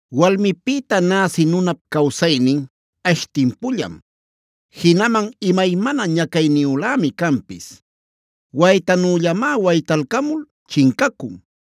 “Walmipïta näsï nunap cawsaynin ash timpullam, jinaman imaymana ñacayniyülämi canpis. Waytanüllamá waytalcamul chincacun.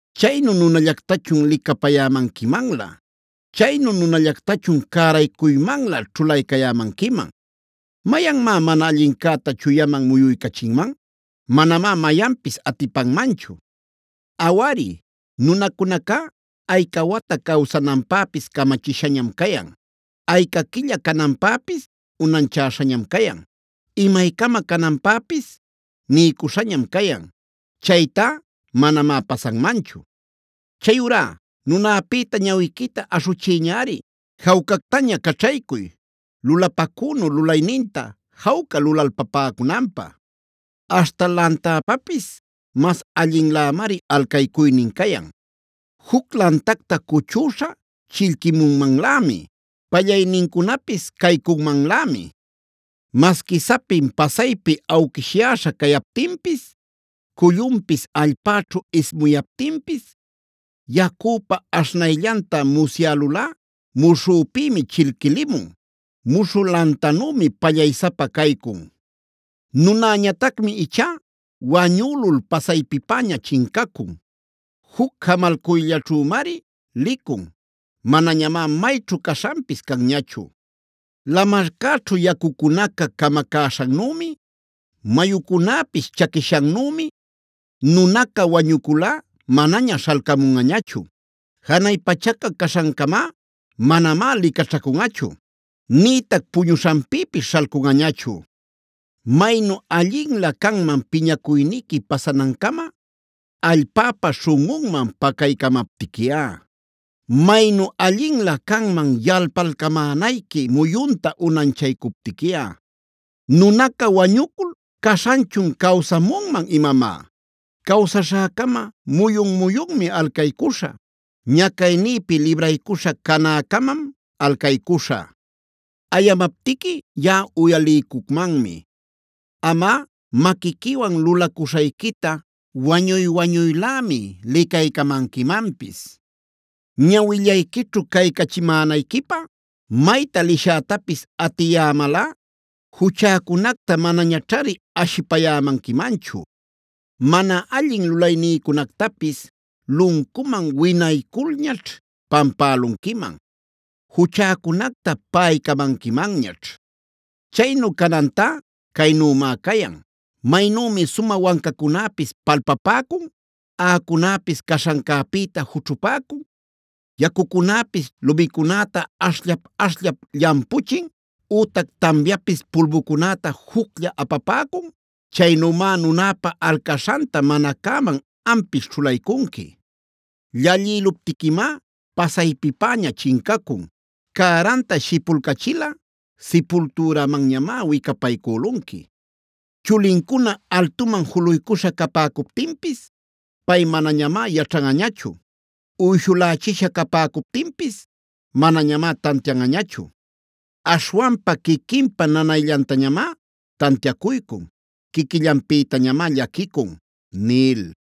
¿Chaynu nunallactachun licapäcayämanquimanlä? ¿Chaynu nunallactachun cäraycuymanlä ćhulaycayämanquiman? ¿¡Mayanmá mana allincäta chuyaman muyuycachinman!? Manamá mayanpis atipanmanchu. Awari, nunacunacá ayca wata cawsananpäpis camachishañam cayan, ayca quilla cananpäpis unanchäśhañam cayan, imaycama cananpäpis niycuśhañam cayan, chaytá manamá pasanmanchu. Chayurá nunäpïta ñawiquita aśhuchiyñari. Jawcactaña caćhaycuy, lulapacünu lulayninta jawca lulalpapäcunanpä. “Aśhta lantäpapis mas allinlämari alcaycuynin cayan. Juc lantacta cuchüśha chillquimunmanlämi; pallaynincunapis caycunmanlämi. Masqui sapin pasaypi awquishyäśha cayaptinpis; cullunpis allpäćhu ismuyaptinpis, yacüpa aśhnayllanta musyälulꞌa muśhüpïmi chillquilimun; muśhü lantanümi pallaysapa caycun. Nunäñatacmi ichá wañülul pasaypipäña chincacun. Juc jamalcuyllaćhümari licun; manañamá mayćhu caśhanpis canñachu. Lamarcäćhu yacucunaca camacäśhannümi, mayucunäpis chaquishannümi, nunaca wañuculꞌa manaña śhalcamunꞌañachu. Janay pachaca caśhancamá manamá licaćhacunꞌachu, nïtac puñuśhanpïpis śhalcunꞌañachu. “Maynu allinlä canman piñacuyniqui pasanancama, allpäpa śhunꞌunman pacaycämaptiquiꞌa. Maynu allinlä canman yalpalcamänayqui muyunta unanchaycuptiquiꞌa. Nunaca wañucul ¿¡caśhanchun cawsamunman imamá!? Cawsaśhäcama muyun-muyunmi alcaycuśhä. Ñacaynïpi libraycuśha canäcamam alcaycuśhä. Ayamaptiqui yaꞌa uyaliycucmanmi; amꞌa maquiquiwan lulacuśhayquita wañuy-wañuylämi licaycamanquimanpis. Ñawillayquićhu caycachimänayquipä mayta lishätapis atiyämalꞌa juchäcunacta manañaćhari ashipayämanquimanchu. Mana allin lulaynïcunactapis luncuman winayculñaćh pampälunquiman; juchäcunacta paꞌaycamanquimanñaćh. “Chaynu canantá caynümá cayan: Maynümi sumä wancacunäpis palpapäcun, aꞌacunäpis caśhancäpïta jućhupäcun, yacucunäpis lumicunäta ashllap-ashllap llampuchin, ütac tamyapis pulbucunäta juclla apapäcun, chaynümá nunäpa alcaśhanta mana cäman ampis ćhulaycunqui. Llallïluptiquimá pasaypipäña chincacun, cäranta shipulcachilꞌa, sipultürämanñamá wicapaycülunqui. Chulincuna altuman juluycuśha capäcuptinpis pay manañamá yaćhanꞌañachu. Uyshulächisha capäcuptinpis manañamá tantianꞌañachu. Aśhwanpa quiquinpa nanayllantañamá tantiacuycun; quiquillanpïtañamá llaquicun” nil.